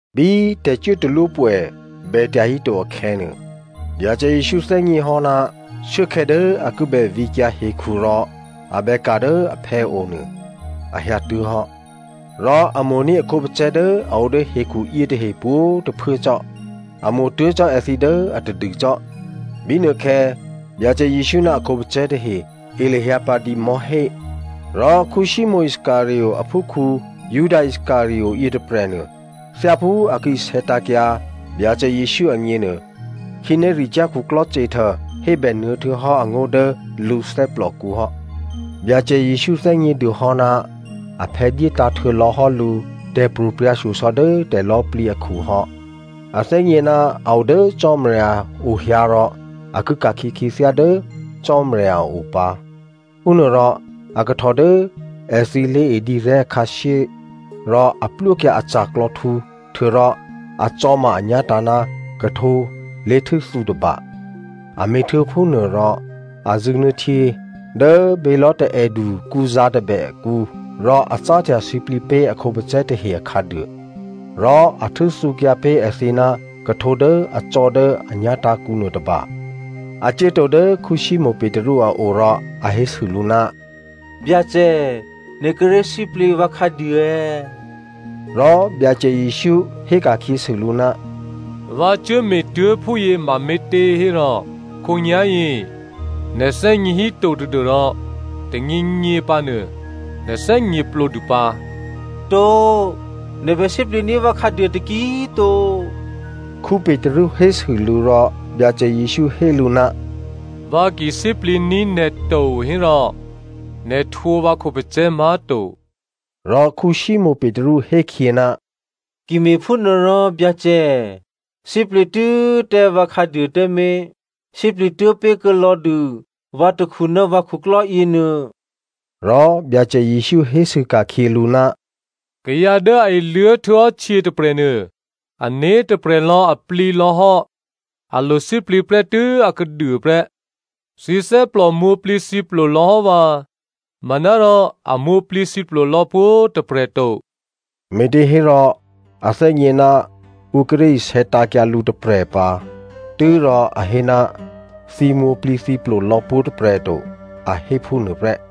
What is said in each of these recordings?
Bí tè̤cuốtalwópwè̌ bètya híto akhè̌nuô, Byacè Jesǔ thè́gněhò́ ná shuốkhè̌ dố a ki bè vǐkyǎ hekhu rò a bè ka̤ dố aphè̌o nuô a hyǎtuố̤hò́. Rò a mo̤ní̤ a khǒpacè̤̌ dố a o dố hekhu yětahe pwǒ̤꤮ tôphuố cò́. A mo̤ tuố̤ cò́ èthǐ dố a tadû cò́. Bínuôkhè̌ Byacè Jesǔ ná a khǒpacè̤̌ tahe e lahyǎ pǎ dǐ mò̤́hé. Rò Simonè Iscariot aphúkhǔ Juda Iscariot yětôprè̤nuô, thyáphú a ki isè̌tǎ̤kyǎ Byacè Jesǔ agněnuô, khǐnéricyá̤ khuklò́ Satan hébènuô̌ htuô̌hò́ angó̤ dố lǔ thè́plòkǔ hò́. Byacè Jesǔ thè́gnědûhò́ ná aphè̌ dyétǎ̤ htuô̌lò̌hò́ lǔ tè̤pro̤prya̤ shyosò̌ dố tè̤lò̌꤮ plǐ akhu hò́. A thè́gně ná a o dố Cò́marya ohyǎ rò a ki ka̤khyě khyěthyá dố Cò́marya a o pǎ. Phúnuôrò a kahtò dố èthǐ lé̤e dǐrè̤́ khǎshyé rò a plwókyǎ a ca̤klò̌htǔ htuô̌rò a cò̌ma anyá̤tǎ̤ ná khuhtǒ lé̤htû́thǔ tôba. A me̤htuô̌ phúnuôrò, a zṳ̂nuô̌ htyě dố bělò̤́ taè̌du kǔzǎ̤ tôbè akǔ rò a cáhtya sǐplǐ pé̤ a khǒpacè̤̌ tahe akhǎduô. Rò a htû́thǔkyǎ pé̤ èthǐ ná khuhtǒ dố a cò̌ dố a nyá̤tǎ̤kǔ nuôtôba. A cuốtǒ dố Simonè Petru a o rò a hésû lǔ, “Byacè nè̤ kíré̤ sǐplǐ vǎ khǎduô è̌?” Rò Byacè Jesǔ héka̤khyěsû lǔ, “Vǎ cuốme̤ tuố̤ phúyě mame̤těhérò khǒnyá̤yě nè̤ thè́gně híto tadû́rò tônyěnyě pǎnuô, nè̤ thè́gněplǒdû pǎ.” “To꤮, nè̤ bè sǐplǐní̤ vǎ khǎduô taki꤮ to,” Petru hésû lǔ rò Byacè Jesǔ hé lǔ, “Vǎ ki sǐplǐní̤ nè̤ to hérò, nè̤ htwǒ vǎ khǒpacè̤̌ má̤to.” Rò Simonè Petru hé khyě, “Ki me̤phúnuôrò, Byacè, sǐplǐ tû́ tǎ vǎ khǎduô tǎmé̤. Sǐplǐ tuố̤ pé̤kuô̌ lò̌dû vǎ takhu ná vǎ khuklò́ yěnuô.” Rò Byacè Jesǔ hésû ka̤khyě lǔ, “Kayǎ dố a iluố̤ htuô̌hò́ htyě tôprè̤nuô, ané̤ tôprè̤lò̌ a plǐlò̌hò́, a lo sǐplǐ prè́tû́ akhǎduô prè́. Thǐ thè́plò mwǒ̤plǐthǐplo lò̌hò́ vǎ, manárò a mwǒ̤plǐthǐplo lò̌ pwǒ̤꤮ tôprè̤ to.” Me̤těhérò a thè́gně ná ǔ kíré̤ isè̌tǎ̤kyǎ lǔ tôprè̤ pǎ, tû́rò a hé ná thǐ mwǒ̤plǐthǐplo lò̌ pwǒ̤꤮ tôprè̤ to, a hé phúnuô prè́.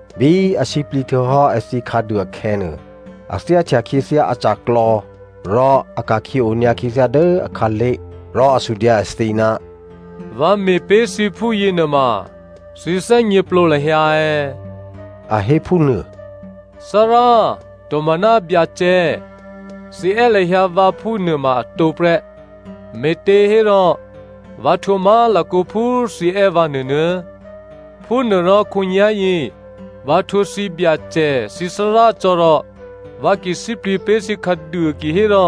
Bí a sǐplǐ htuô̌hò́ èthǐ khǎduô akhè̌nuô, a thyáhtya khyěthyá aca̤klò̌ rò a ka̤khyě onyǎ khyěthyá dố akhǎlé̤. Rò a sudyǎ èthǐ, “Vǎ me̤ pé̤ thǐ phúyě nuôma thǐ thè́gněplǒ lahyǎ è̌?” A hé phúnuô. “‘Thárá,’ tomaná, ‘Byacè,’ thǐ è́ lahyǎ vǎ phúnuôma atǒ prè́, me̤těhérò vǎ htwǒ má̤lakǒ phú thǐ è́ vǎ nuônuô̌꤮. Phúnuôrò khǒnyá̤yě vǎ htwǒ thǐ Byacè thǐ Thárá cò́ rò vǎ ki sǐplǐ pé̤ thǐ khǎduô kihérò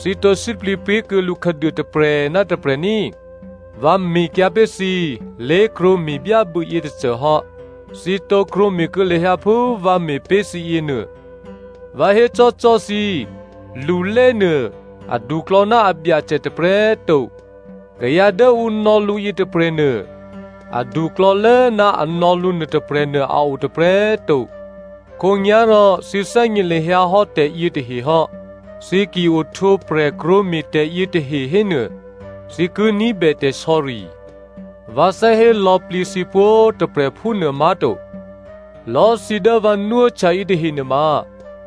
thǐ tǒ sǐplǐ pé̤kuô̌ lǔ khǎduô tôprè̤ ná tôprè̤ ní꤮. Vǎ me̤kyǎ pé̤ thǐ lé̤krwǒ me̤byábû̌ yětôcô hò́. Thǐ tǒ krwǒme̤kuô̌ lahyǎ phú vǎ me̤ pé̤ thǐ yěnuô. Vǎ hécò́cò́ thǐ, lulénuô aduklò̌ ná abyacè tôprè̤꤮ to. Kayǎ dố ǔ nò̌ lǔ yětôprè̤nuô aduklò̌lố ná a nò̌ lǔ nuôtôprè̤nuô a o tôprè̤꤮ to. Khǒnyá̤rò thǐ thè́gně lahyǎ hò́ tè̤yětahe hò́. Thǐ ki ohtwǒprè̤ krwǒme̤ tè̤yětahe hénuô, thǐ ki ní̤bè tè̤sò̌ri. “Vǎ thè́ hé lò̌plǐ thǐ pwǒ̤꤮ tôprè̤ phúnuô má̤to. Lò̌꤮ thǐ dố vǎ nwóhtya yětahe nuôma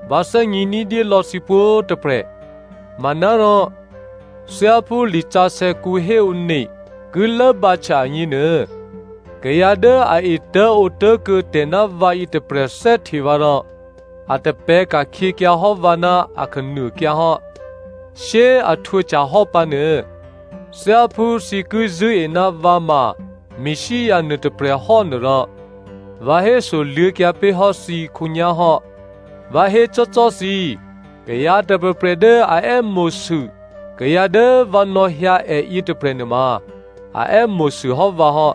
vǎ thè́gně ní̤dyé lò̌ thǐ pwǒ̤꤮ tôprè̤. Manárò thyáphú lisǎsè̌kǔ héone ki lốbǎhtya agněnuô, ‘Kayǎ dố a etố̤ǒtố̤kuô̌ tè̤ ná vǎ yětôprè̤ thè́hte vǎ rò a tapè̤̌ ka̤khyěkyǎ hò́ vǎ ná akhǎnuôkyǎ hò́.’ “Shyé꤮ a htwǒhtyahò́ pǎnuô, thyáphú thǐ ki zṳ̂́e ná vǎ ma Messia nuô tôprè̤hò́ nuôrò, vǎ hésoluô̌kyǎ pé̤ hò́ thǐ khǒnyá̤ hò́. Vǎ hécò́cò́ thǐ, kayǎ tôprè̤prè̤ dố a è́mo̤sû kayǎ dố vǎ nò̌hyǎ è yětôprè̤ nuôma, a è́mo̤sû hò́ vǎ hò́.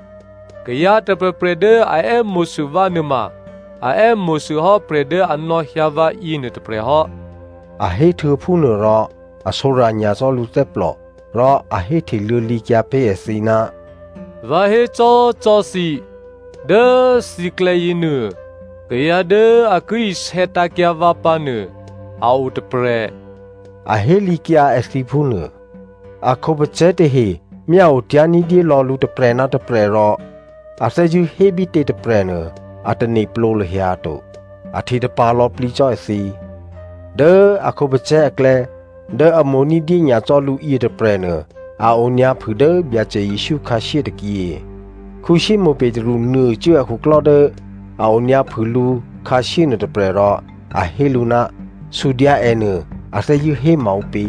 Kayǎ tôprè̤prè̤ dố a è́mo̤sû vǎ nuôma a è́mo̤sû hò́ prè̤ dố a nò̌hyǎ vǎyě nuôtôprè̤ hò́.” A héhtuô̌ phúnuôrò, a sǒrya̤ nyacò́ lǔthè́plò rò a héhte luô̌lǐkyǎ pé̤ èthǐ, “Vǎ hécò́cò́ thǐ, dố thǐklè̌ yěnuô kayǎ dố a ki isè̌tǎ̤kyǎ vǎ pǎnuô a o tôprè̤,” a hélǐkyǎ èthǐ phúnuô. A khǒpacè̤̌ tahe myáotyá̤ ní̤dyé lò̌ lǔ tôprè̤ ná tôprè̤ rò a thè́zṳ̂́ hé bítě tôprè̤ nuô, a tane̤plǒ lahyǎ to, a hte tapa̤ lò̌plǐ cò́ èthǐ. Dố a khǒpacè̤̌ aklè̌ dố a mo̤ ní̤dyé nyacò́ lǔ yětôprè̤nuô, a onyǎphû dố Byacè Jesǔ khǎshyé tôkyě. Simonè Petru nuôcuố akhuklò́ dố a onyǎphû lǔ khǎshyé nuôtôprè̤ rò a hé lǔ, “Sudyǎ è nuô, a thè́zṳ̂́ hé maǔpě?”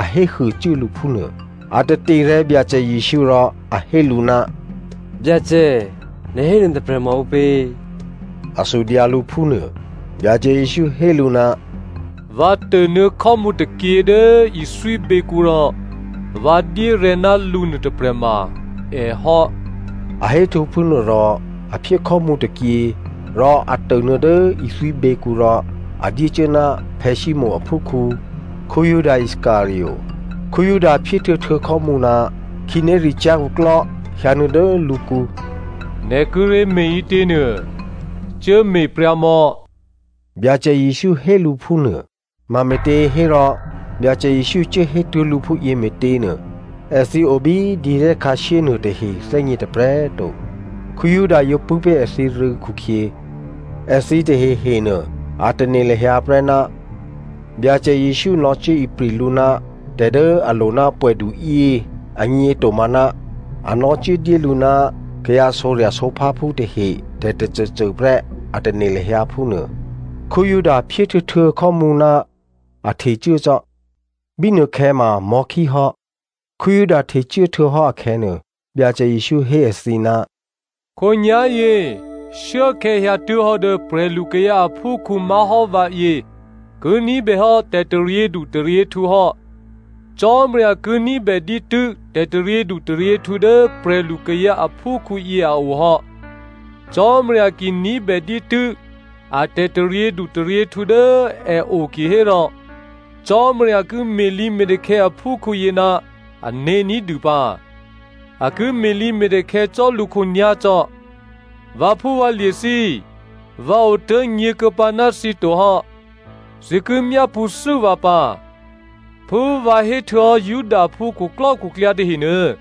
A héhuô cuố lǔ phúnuô. A taterè̤̌ Byacè Jesǔ rò a hé lǔ, “Byacè, nè̤ hé nuôtôprè̤ ma ǔpě?” A sudyǎ lǔ phúnuô. Byacè Jesǔ hé lǔ, “Vǎ tônuô̌ khò́mǔ tôkyě dố ithwíběkǔ rò vǎ dyérè̤̌ ná lǔ nuôtôprè̤ ma èhò́.” A héhtuô̌ phúnuô rò a phyé khò́mǔ tôkyě rò a tônuô̌ dố ithwíběkǔ rò a dyécuố ná Simonè aphúkhǔ Juda Iscariot. Juda phyéhtuô̌htuô̌ khò́mǔ, khǐnéricyá̤ khuklò́ hyǎnuô̌ dố lǔkǔ. “Nè̤ kíré̤ me̤ ǐtěnuô, cuố me̤pryǎmò̌,” Byacè Jesǔ hé lǔ phúnuô. Mame̤těhérò Byacè Jesǔ cuố hétuố̤ lǔ phúyě me̤tě꤮ nuô, èthǐ o bí dǐrè̤́ khǎshyé nuôtahe thè́gně tôprè̤꤮ to. Juda yǒ pṳ̂́ pé̤ èthǐrû̌ khukhyě, èthǐ tahehe nuô, a tane̤ lahyǎ prè́ ná Byacè Jesǔ nò̌cuố ipri̤ lǔ ná tè̤ dố a lo ná pwè̌duyě agně tomaná a nò̌cuố dyé lǔ ná kayǎ sǒrya̤sǒpháphú tahe tè̤tôcôcô prè́, a tane̤ lahyǎ phúnuô. Juda phyéhtuô̌htuô̌ khò́mǔ, a htecuố cò́. Bínuôkhè̌ ma mò̤́khí hò́. Juda htecuố htuô̌hò́ akhè̌nuô, Byacè Jesǔ hé èthǐ, “Khǒnyá̤yě shuốkhè̌ hyǎtuố̤hò́ dố prè̤lukayǎ aphúkhǔ má̤hò́ vǎyě ki ní̤bèhò́ tè̤taryědu taryěhtǔ hò́. Cò́marya ki ní̤bè dǐtû́ tè̤taryědu taryěhtǔ dố prè̤lu kayǎ aphúkhǔyě a o hò́. Cò́marya ki ní̤bè dǐtû́ a tè̤taryědu taryěhtǔ dố è o kihérò Cò́marya ki me̤lǐme̤takhè̌ aphúkhǔyě ná ané̤ ní̤dû pǎ. A ki me̤lǐme̤takhè̌ cò́ lǔ khǒnyá̤cò́. “Vǎphúvǎlye̤ thǐ, vǎ otố̤ nyě̤kuô̌pǎ ná thǐ tohò́. Thǐ ki myápṳ̌thû́ vǎ pǎ. Phú vǎ héhtuô̌hò́ Judaphú khuklò́khuklyǎ tahenuô,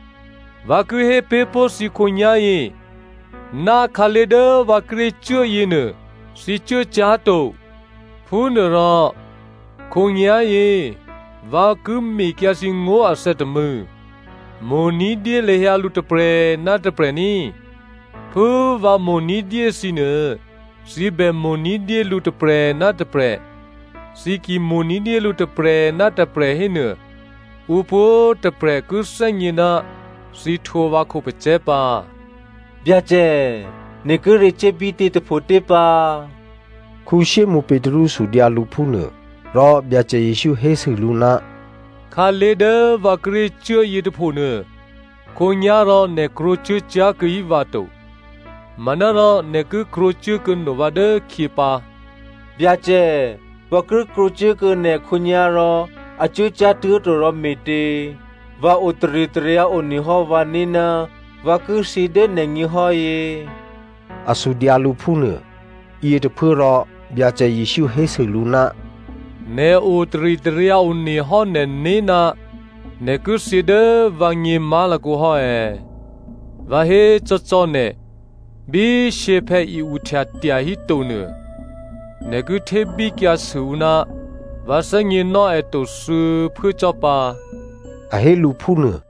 vǎ ki hé pé̤ pó̤ thǐ khǒnyá̤yě ná khǎlé̤ dố vǎ kíré̤ cuố yěnuô, thǐ cuốcyá̤to. “Phúnuôrò khǒnyá̤yě vǎ ki mekyǎ thǐ ngó̤ athè̌ tômû̌. Mo̤ ní̤dyé lahyǎ lǔ tôprè̤ ná tôprè̤ ní꤮. Phú vǎ mo̤ ní̤dyé thǐnuô, thǐ bè mo̤ ní̤dyé lǔ tôprè̤ ná tôprè̤. Thǐ ki mo̤ ní̤dyé lǔ tôprè̤ ná tôprè̤ hénuô, ǔ pwǒ̤꤮ tôprè̤ ki thè́gně ná thǐ htwǒ vǎ khǒpacè̤̌ pǎ.” “Byacè, nè̤ kíré̤ cuố bítě tôphotě pǎ?” Simonè Petru sudyǎ lǔ phúnuô. Rò Byacè Jesǔ hésû lǔ, “Khǎlé̤ dố vǎ kíré̤ cuố yětôphonuô, khǒnyá̤rò nè̤ krwǒcuố cyá̤ kuô̌hí vǎ to. Manárò nè̤ ki krwǒcuố kuô̌no vǎ dốkhyě pǎ.” “Byacè, vǎ ki krwǒcuốkuô̌ nè̤ khǒnyá̤rò a cuố cyá̤tuố̤torò me̤tě? Vǎ o taritaryǎ onehò́ vǎné̤ ná vǎ ki thyě dố nè̤gněhò́ yě.” A sudyǎ lǔ phúnuô. Yětôphuốrò Byacè Jesǔ hésû lǔ, “Nè̤ o taritaryǎ one hò́ nè̤né̤ ná nè̤ ki thyě dố vǎgně má̤lakǒ hò́ è̌? Vǎ hécò́cò́ nè̤, bí shyěphè̌ i-uhtya tyahíto nuô, nè̤ ki htébíkyǎsû ǔ ná vǎ thè́gněnò́ è to thuô̌phuố cò́ pǎ,” a hé lǔ phúnuô.